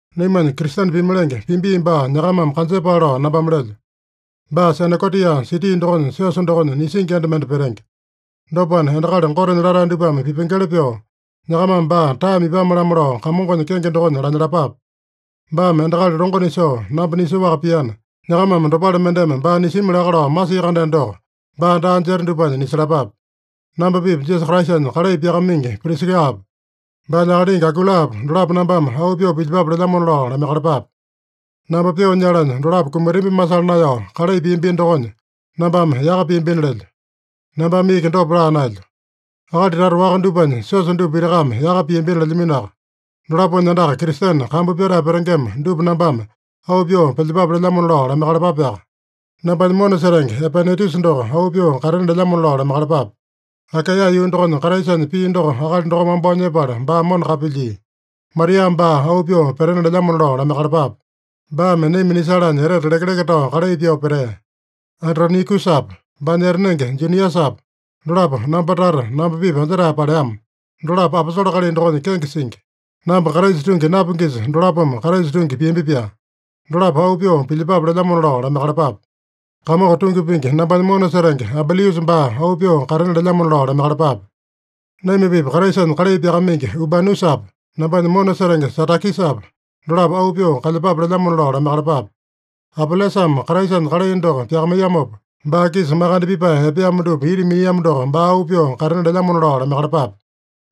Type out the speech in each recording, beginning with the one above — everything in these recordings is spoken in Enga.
Naimanya Kristene pimalenge Pibi baa nyakamame kanjepale lao nambame lelyo. Baa Senekotia siti dokonya siosa dokonya nisingi enda mende petenge. Dopana, endakali Gotenya latae dupame pipengeli pyoo, nyakamame baa taeme ipame-lamo lao Kamongonya kenge dokonya lanyalapape. Baame endakali longo nisoo, namba nisoaka piana, nyakamame dopale mendeme baa nisimi laka lao masia-kandeno doko, baa daa jeta dupanya nisalapape. Namba-pipa Jisasa Kraisanya kalai pyakamaingi Prisikapa, baanya akalingi Akuilapa, dolapo nambame auu pyoo pilyepape lelyamona lao lamaiyakalapape. Namba pyoo nyalanya, dolapo kumatambi masala naeyao kalai piambino dokonya, nambame yaka piambina lelyo. Nambame iki dopa laa naelyo. Akali tata waka dupanya siosa dupa pitakame yaka piambina lelyaminoaka. Dolaponya andaka Kristene kambu pyatae petengema dupa nambame auu pyoo pilyepape lelyamona lao lamaiyakalapape. Nambanya mona setenge Epainetusa doko auu pyoo katena lelyamona lao lamaiyakalapape. Akaeya yuu dokonya Kraisanya pii doko akali dokome wambao nyepala baa mona kapilyia. Maria baa auu pyoo petena lelyamona lao lamaiyakalapape. Baame naima nisalanya etete lekeleke tao kalai pyoo petea. Andronikusapa, baanya etanenge Juniasapa, dolapo namba tata, namba-pipa anjetae paleama. Dolapo aposole kalai dokonya kenge singi. Namba Kraisa tungi napingisa dolapome Kraisa tungi piambi-pyaa. Dolapo auu pyoo pilyepape lelyamona lao lamaiyakalapape. Kamongo tungi pingi nambanya mona setenge Ambiliusa baa auu pyoo katena lelyamona lao lamaiyakalapape. Naima-pipa Kraisanya kalai pyakamaingi Urbanusapa, nambanya mona setenge Satakisapa, dolapo auu pyoo kalyepape lelyamona lao lamaiyakalapape. Apelesame Kraisanya kalai doko pyakamaiyamopa, baa-kisa makande pipae epeamo dupa ita miniamo doko baa auu pyoo katena lelyamona lao lamaiyakalapape.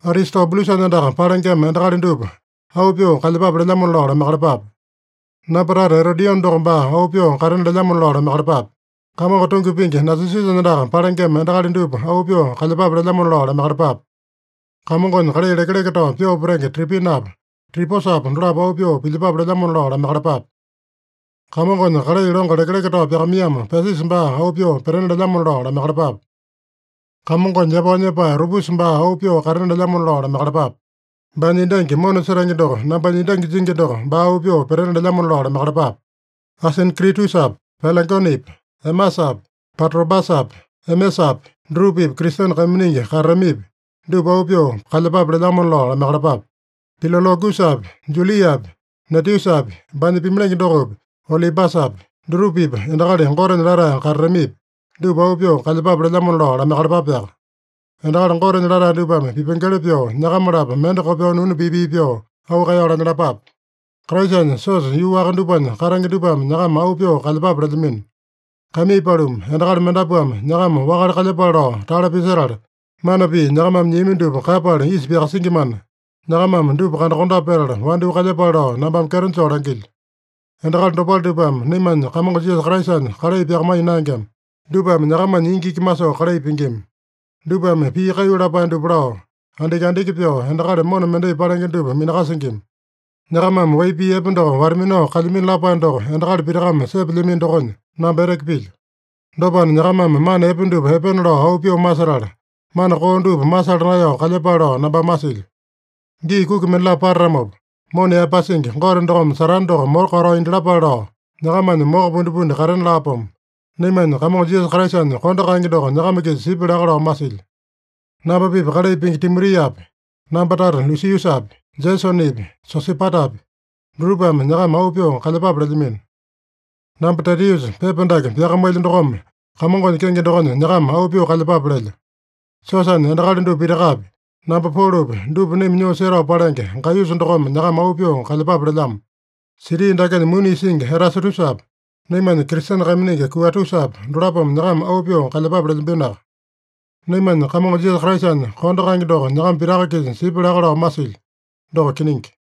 Aristobulusanya andaka palengema endakali dupa auu pyoo kalyepape lelyamona lao lamaiyakalapape. Namba tata Erodione doko baa auu pyoo katena lelyamona lao lamaiyakalapape. Kamongo tungi pingi Nasisusanya andaka palengema endakali dupa auu pyoo kalyepape lelyamona lao lamaiyakalapape. Kamongonya kalai lekeleke tao pyoo petenge Tripinapa, Triposapa dolapo auu pyoo pilyepape lelyamona lao lamaiyakalapape. Kamongonya kalai longo lekeleke tao pyakamaiyamo Pesisa baa auu pyoo petena lelyamona lao lamaiyakalapape. Kamongonya yapao nyepae Rupusa baa auu pyoo katena lelyamona lao lamaiyakalapape. Baanya endangi mona setenge doko nambanya endangi jingi doko baa auu pyoo petena lelyamona lao lamaiyakalapape. Asinkritusapi, Pelegonepi, Emasapi, Patrobasapi, Emesapi, dutupa-pipa Kristene kaiminingi katatamipi, dupa auu pyoo kalyepape lelyamona lao lamaiyakalapape. Pilologusapi, Juliapi, Neteusapi, baanya pimalenge dokopi, Olimbasapi, dutupa-pipa endakali Gotenya latae katatamipi, dupa auu pyoo kalyepape lelyamona lao lamaiyakalapapeaka. Endakali Gotenya latae dupame pipengeli pyoo, nyakama-lapo mende kopyoo nunu pii-pii pyoo auu kaeyao lanyalapape. Kraisanya siosa yuu waka dupanya katenge dupame nyakama auu pyoo kalyepape lelyamino. Kaimii paluma, endakali mendapuame nyakama wakale kalyepale lao tale pisetala, mana pii nyakamame nyiami dupa kaeyapala isa pyakasingimana, nyakamame dupa kandakondape petala wandyoo kalyepale lao nambame kyeto joo langilyo. Endakali dopale dupame naimanya Kamongo Jisasa Kraisanya kalai pyakamaiya naengema. Dupame nyakamanya ingi iki masoo kalai pingima. Dupame pii kaiyu lapae dupa lao, andiki-andiki pyoo endakali mona mendai palenge dupa minakasingima. Nyakamame wai pii epe doko wata-minao kalyamino lapae doko endakali pitakame sepelyamino dokonya, namba eteke pilyo. Dopana, nyakamame mana epe dupa epena lao auu pyoo masetala, mana koo dupa masala naeyao kalyepale lao nambame masilyo. Gii kuki mendalapo patatamopa, mona yaepasingi Gote dokome Satane doko moko katao indyalapale lao, nyakamanya moko pundipundi katena laapomo. Naimanya Kamongo Jisasa Kraisanya kondo kaenge doko nyakama-kisa sipya laka lao masilyo. Namba-pipa kalai pingi Timotiapi, namba tata Lusiusapi, Jesonepi, Sosipatapi, dutupame nyakama auu pyoo kalyepape lelyamino. Namba Tetiusa, pepa dake pyakamailyo dokome Kamongonya kenge dokonya nyakama auu pyoo kalyepape lelyo. Siosanya endakali dupa pitakapi, namba Polopi, dupa naima nyoo setao palenge Gaiyusa dokome nyakama auu pyoo kalyepape lelyamo. Siti dakenya muni isingi Erasatusapa, naimanya Kristene kaiminingi Kuatusapa, dolapome nyakama auu pyoo kalyepape lelyambinoaka. Naimanya Kamongo Jisasa Kraisanya kondo kaenge doko nyakama pitaka-kisa sipya laka lao masilyo. Doko kiningi.